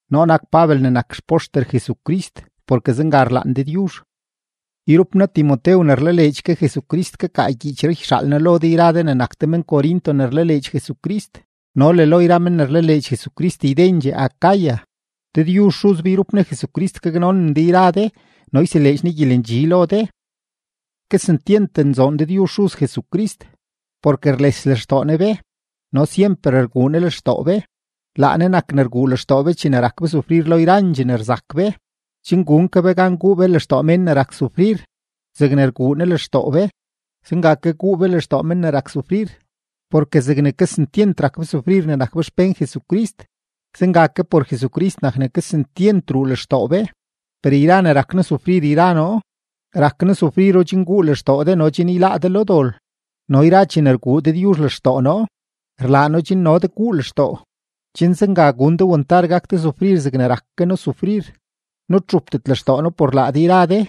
Noo nak Pabel ne nak xpoxter Jesucrist porke zenga rlaan Dëdyuzh. Yrup noo Timotew ne rlaleedx ke Jesucrist kakaa gyiichree yxaal noo lo de yra de ne nak de men-Corinto ne rlaleedx Jesucrist no le lo yra men ne rlaleedx Jesucrist ydendxee Acaya. Dëdyuzh Xuz be yrup Ne Jesucrist gaknonen de yra de no yseleedx Ne gyelendxi lo de. Kesentyent nzoon Dëdyuzh Xuz Jesucrist, porke rles lextoo Ne be no syemper rguu Ne lextoo be. Laa Ne nak ne rguu lextoo be chene rak be sufrir lo yrandxee ne rzak be, chen gun ke be gan guu be lextoo mén ne rak sufrir; zegne rguu Ne lextoo be, zenga ke guu be lextoo men ne rak sufrir. Porke zegne kesentyent rak be sufrir ne nak be xpén Jesucrist, zenga ke por Jesucrist nak ne kesentyent ruu lextoo be. Per yra ne rak noo sufrir yra noo, rak noo sufriro chen guu lextoo de no chen yláá de lo dol; no yra chene rguu Dëdyuzh lextoo noo, rlaa No chen no de guu lextoo, chen zenga gun de wantar gak de sufrir zegne rak ke noo sufrir. Nutxupdet lextoo noo por laa de yra de,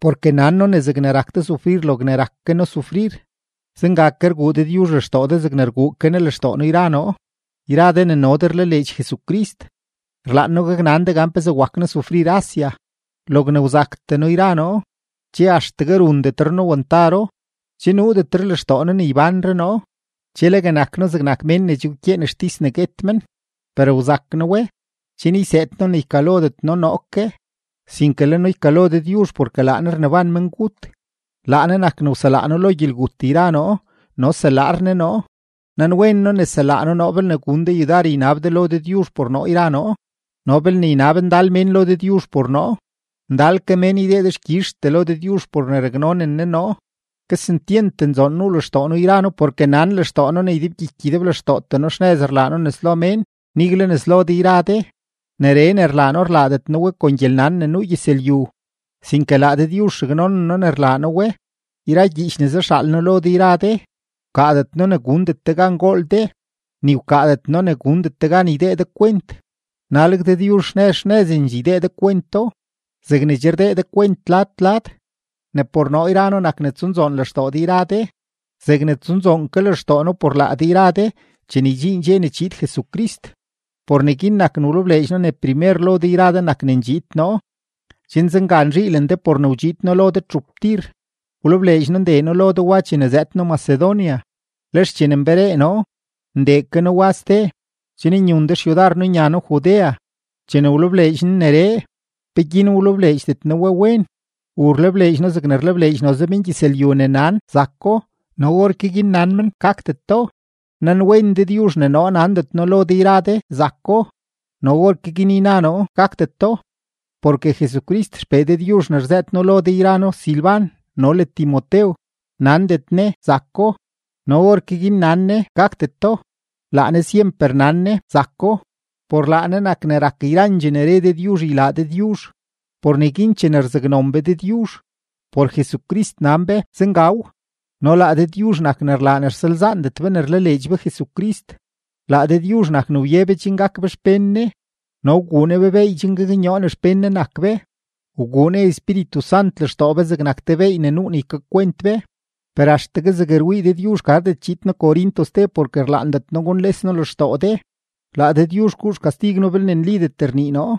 porke nan noo ne zegne rak de sufrir logne rak ke noo sufrir, zenga ke rguu Dëdyuzh lextoo de zegne rguu ke Ne lextoo noo yra noo. Yra de ne no de rlaleedx Jesucrist, rlaan noo gaknan de gan pezee wak noo sufrir Asia. Logne wzaktee noo yra noo, che axtegue rundetre noo wantaro, che nuudetre lextoo noo ne ybánre noo. Che legue nak noo zegnak mén ne che wkyeen xtis ne guet men. Per wzak noo we, chen yseed noo ne ykalodet noo noo ke, sinke le noo ykalo Dëdyuzh porke laa Ne rneban mengut. Laa Ne nak ne wselaa noo lo gyelgut yra noo no selaar Ne noo. Nanwen noo ne selaa Ne noo belne gun de yudar ynab de lo Dëdyuzh por noo yra noo. No belne ynab ndal mén lo Dëdyuzh por noo, ndal ke mén ydee dexkyizhtee lo Dëdyuzh por ne raknonen Ne noo. Kesentyent nzoon nuu lextoo noo yra noo, porke nan lextoo noo ne ydebgyiky ydeblextootee noo xnëz rlaa noo nes lo mén, nigle nes lo de yra de; neree ne rlaa noo rlaadet noo we kon gyelnan ne nuu gyëzlyu, sinke laa Dëdyuzh raknonen noo ne rlaa noo we. Yra gyiich ne zaxaal noo lo de yra de, wkaadet noo ne gundet de gan gool de, ni wkaadet noo ne gundet de gan ydee de kwent. Naleg Dëdyuzh xnëz xnëzendxee ydee de kwento zegne che rdee de kwent lad lad, ne por noo yra noo nak ne tsunzoon lextoo de yra de zegne tsunzoon ke lextoo noo por laa de yra de chene ydxiin dxe ne chiid Jesucrist. Por neguin nak ne wlebleedx noo ne primer lo de yra de nak ne ndxiid noo, chen zenga nzhiilen de por ne wdxiid noo lo de txup tir. Wlebleedx noo ndee noo lo de wa chene zëëd noo Macedonia, lex chene nberee noo, ndee ke noo wa ste, chen nyun de xyudar noo nya noo Judea. Chene wlebleedx noo neree, ¿peguin wlebleedxdet noo we wen? ¿U rlebleedx noo zegne rlebleedx noze mengyëzlyu ne nan “zako” no orke guin nan men “gakdeto”? Nanwen Dëdyuzh ne noo nandet noo lo de yra de “zako” no orke guin yna noo “gakdeto”. Porke Jesucrist XPee Dëdyuzh ne rzëët noo lo de yra noo Silban no le Timotew, nandet Ne “zako” no orke guin nan Ne “gakdeto”, laa Ne syemper nan Ne “zako”. Por laa Ne nak ne rak yrandxee ne re Dëdyuzh ylaa Dëdyuzh. Por neguin chene rzaknon be Dëdyuzh, por Jesucrist nan be “Zengaw”. No laa Dëdyuzh nak ne rlaa ne rsalzaandet be ne rlaleedx be Jesucrist; laa Dëdyuzh nak ne wye be chen gak be xpén Ne, no wguu Ne be beey chen gaknyoo ne xpén Ne nak be, wguu Ne Espíritu Sant lextoo be zegnak te beey ne nuu ne ykakwent be. Per axtegue zeg rwii Dëdyuzh gardet chiid noo Corinto ste porke rlaandet noo gunles noo lextoo de; laa Dëdyuzh guu xkastig noo belne nlidet rnii noo.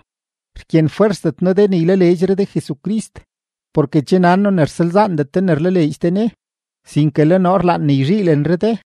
Rkyenfwersdet noo de ne ylaleedxre de Jesucrist, porke che nan noo ne rsalzaandet de ne rlaleedx de Ne; sinke le noo rlaan ne yzhiilenre de.